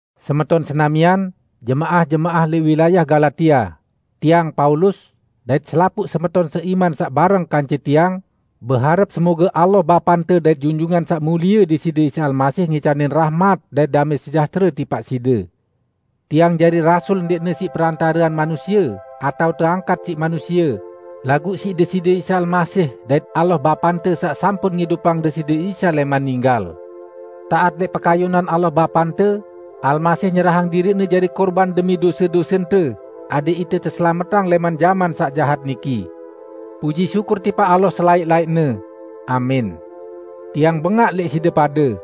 Semeton senamian, jemaah-jemaah lẽq wilayah Galatia, tiang Paulus, dait selapuq semeton seiman saq bareng kance tiang, beharep semoge Allah Bapante dait Junjungan Saq Mulie Deside Isa Almasih ngicanin rahmat dait damẽ sejahtere tipaq side. Tiang jari rasul ndẽqne siq perantarean manusie atao teangkat siq manusie, laguq siq Deside Isa Almasih dait Allah Bapante saq sampun ngidupang Deside Isa lẽman ninggal. Taat lẽq pekayunan Allah Bapante, Almasih nyerahang diriq-Ne jari kurban demi dose-dosente, adẽq ite teselametang lẽman jaman saq jahat niki. Puji syukur tipaq Allah selaẽq-laẽqne! Amin. Tiang bengaq lẽq side pade!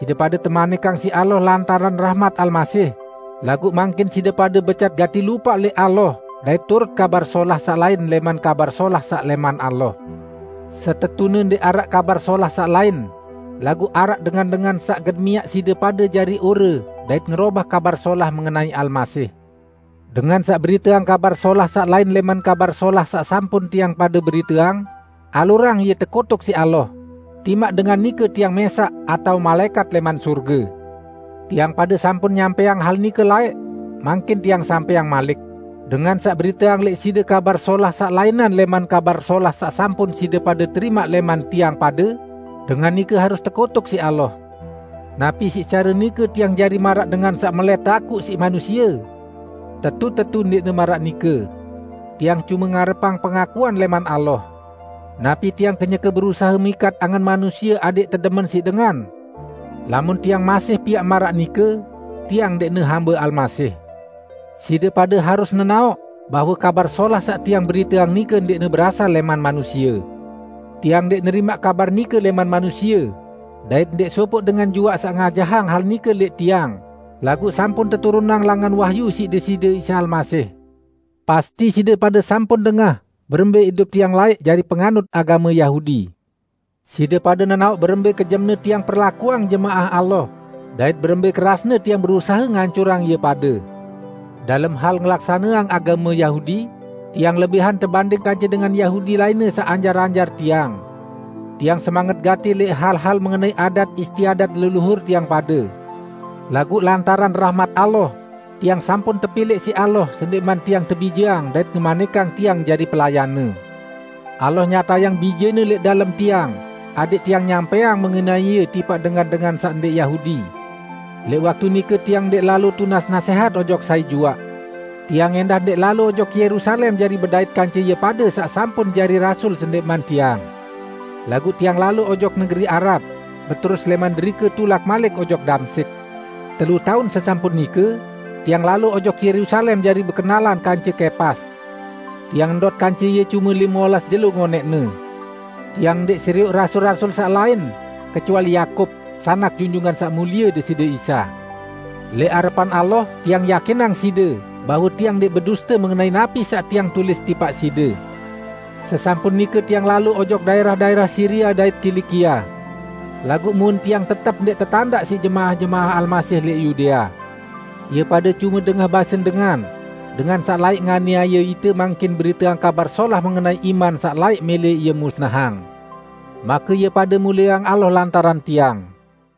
Side pade temanikang siq Allah lantaran rahmat Almasih, laguq mangkin side pade becat gati lupaq lẽq Allah dait turut "kabar solah" saq lain lẽman Kabar Solah saq lẽman Allah. Setetune ndẽq araq "kabar solah saq lain", laguq araq dengan-dengan saq gen miaq side pade jari ore dait ngerobah Kabar Solah mengenai Almasih. Dengan saq beriteang "kabar solah" saq lain lẽman Kabar Solah saq sampun tiang pade beriteang, alurang ie tekutuk siq Allah -- timaq dengan nike tiang mẽsaq atao malaẽkat lẽman sorge! Tiang pade sampun nyampẽang hal nike laẽq, mangkin tiang sampẽang malik: Dengan saq beriteang lẽq side "kabar solah" saq lainan lẽman Kabar Solah saq sampun side pade terimaq lẽman tiang pade, dengan nike harus tekutuk siq Allah! Napi siq care nike tiang jari maraq dengan saq melẽt teakuq siq manusie? Tetu-tetu ndẽqne maraq nike! Tiang cume ngarepang pengakuan lẽman Allah. Napi tiang kenyeke berusahe mikat angen manusie adẽq tedemen siq dengan? Lamun tiang masih piaq maraq nike, tiang ndẽqne hambe Almasih. Side pade harus nenaoq bahwe Kabar Solah saq tiang beriteang nike ndẽqne berasal lẽman manusie. Tiang ndẽq nerimaq kabar nike lẽman manusie, dait ndẽq sopoq dengan juaq saq ngajahang hal nike lẽq tiang, laguq sampun teturunang langan wahyu siq Deside Isa Almasih. Pasti side pade sampun dengah berembẽ idup tiang laẽq jari penganut agame Yahudi. Side pade nenaoq berembẽ kejemne tiang perlakuang jemaah Allah dait berembẽ kerasne tiang berusahe ngancurang ie pade. Dalem hal ngelaksaneang agame Yahudi, tiang lebihan tebanding kance dengan Yahudi lainne saq anjar-anjar tiang. Tiang semanget gati lẽq hal-hal mengenai adat istiadat leluhur tiang pade. Laguq lantaran rahmat Allah, tiang sampun tepilẽq siq Allah sendẽqman tiang tebijeang dait ngemanikang tiang jari pelayan-Ne. Allah nyatayang Bije-Ne lẽq dalem tiang adẽq tiang nyampẽang mengenai Ie tipaq dengan-dengan saq ndẽq Yahudi. Lẽq waktu nike tiang ndẽq lalo tunas nasẽhat ojok sai juaq. Tiang ẽndah ndẽq lalo ojok Yerusalem jari bedait kance ie pade saq sampun jari rasul sendẽqman tiang. Laguq tiang lalo ojok negeri Arab, beterus lẽman derike tulak malik ojok Damsyik. Telu taun sesampun nike, tiang lalo ojok Yerusalem jari bekenalan kance Kepas. Tiang ndot kance ie cume lime olas jelo ngonẽqne. Tiang ndẽq serioq rasul-rasul saq lain, kecuali Yakub, sanak Junjungan Saq Mulie Deside Isa. Lẽq arepan Allah, tiang yakinang side bahwe tiang ndẽq beduste mengenai napi saq tiang tulis tipaq side. Sesampun nike tiang lalo ojok daẽrah-daẽrah Siria dait Kilikia. Laguq muen tiang tetep ndẽq tetandaq siq jemaah-jemaah Almasih lẽq Yudea. Ie pade cume dengah basen dengan, "Dengan saq laẽq nganiaye ite, mangkin beriteang kabar solah mengenai iman saq laẽq mẽlẽ ie musnahang." Make, ie pade mulieang Allah lantaran tiang.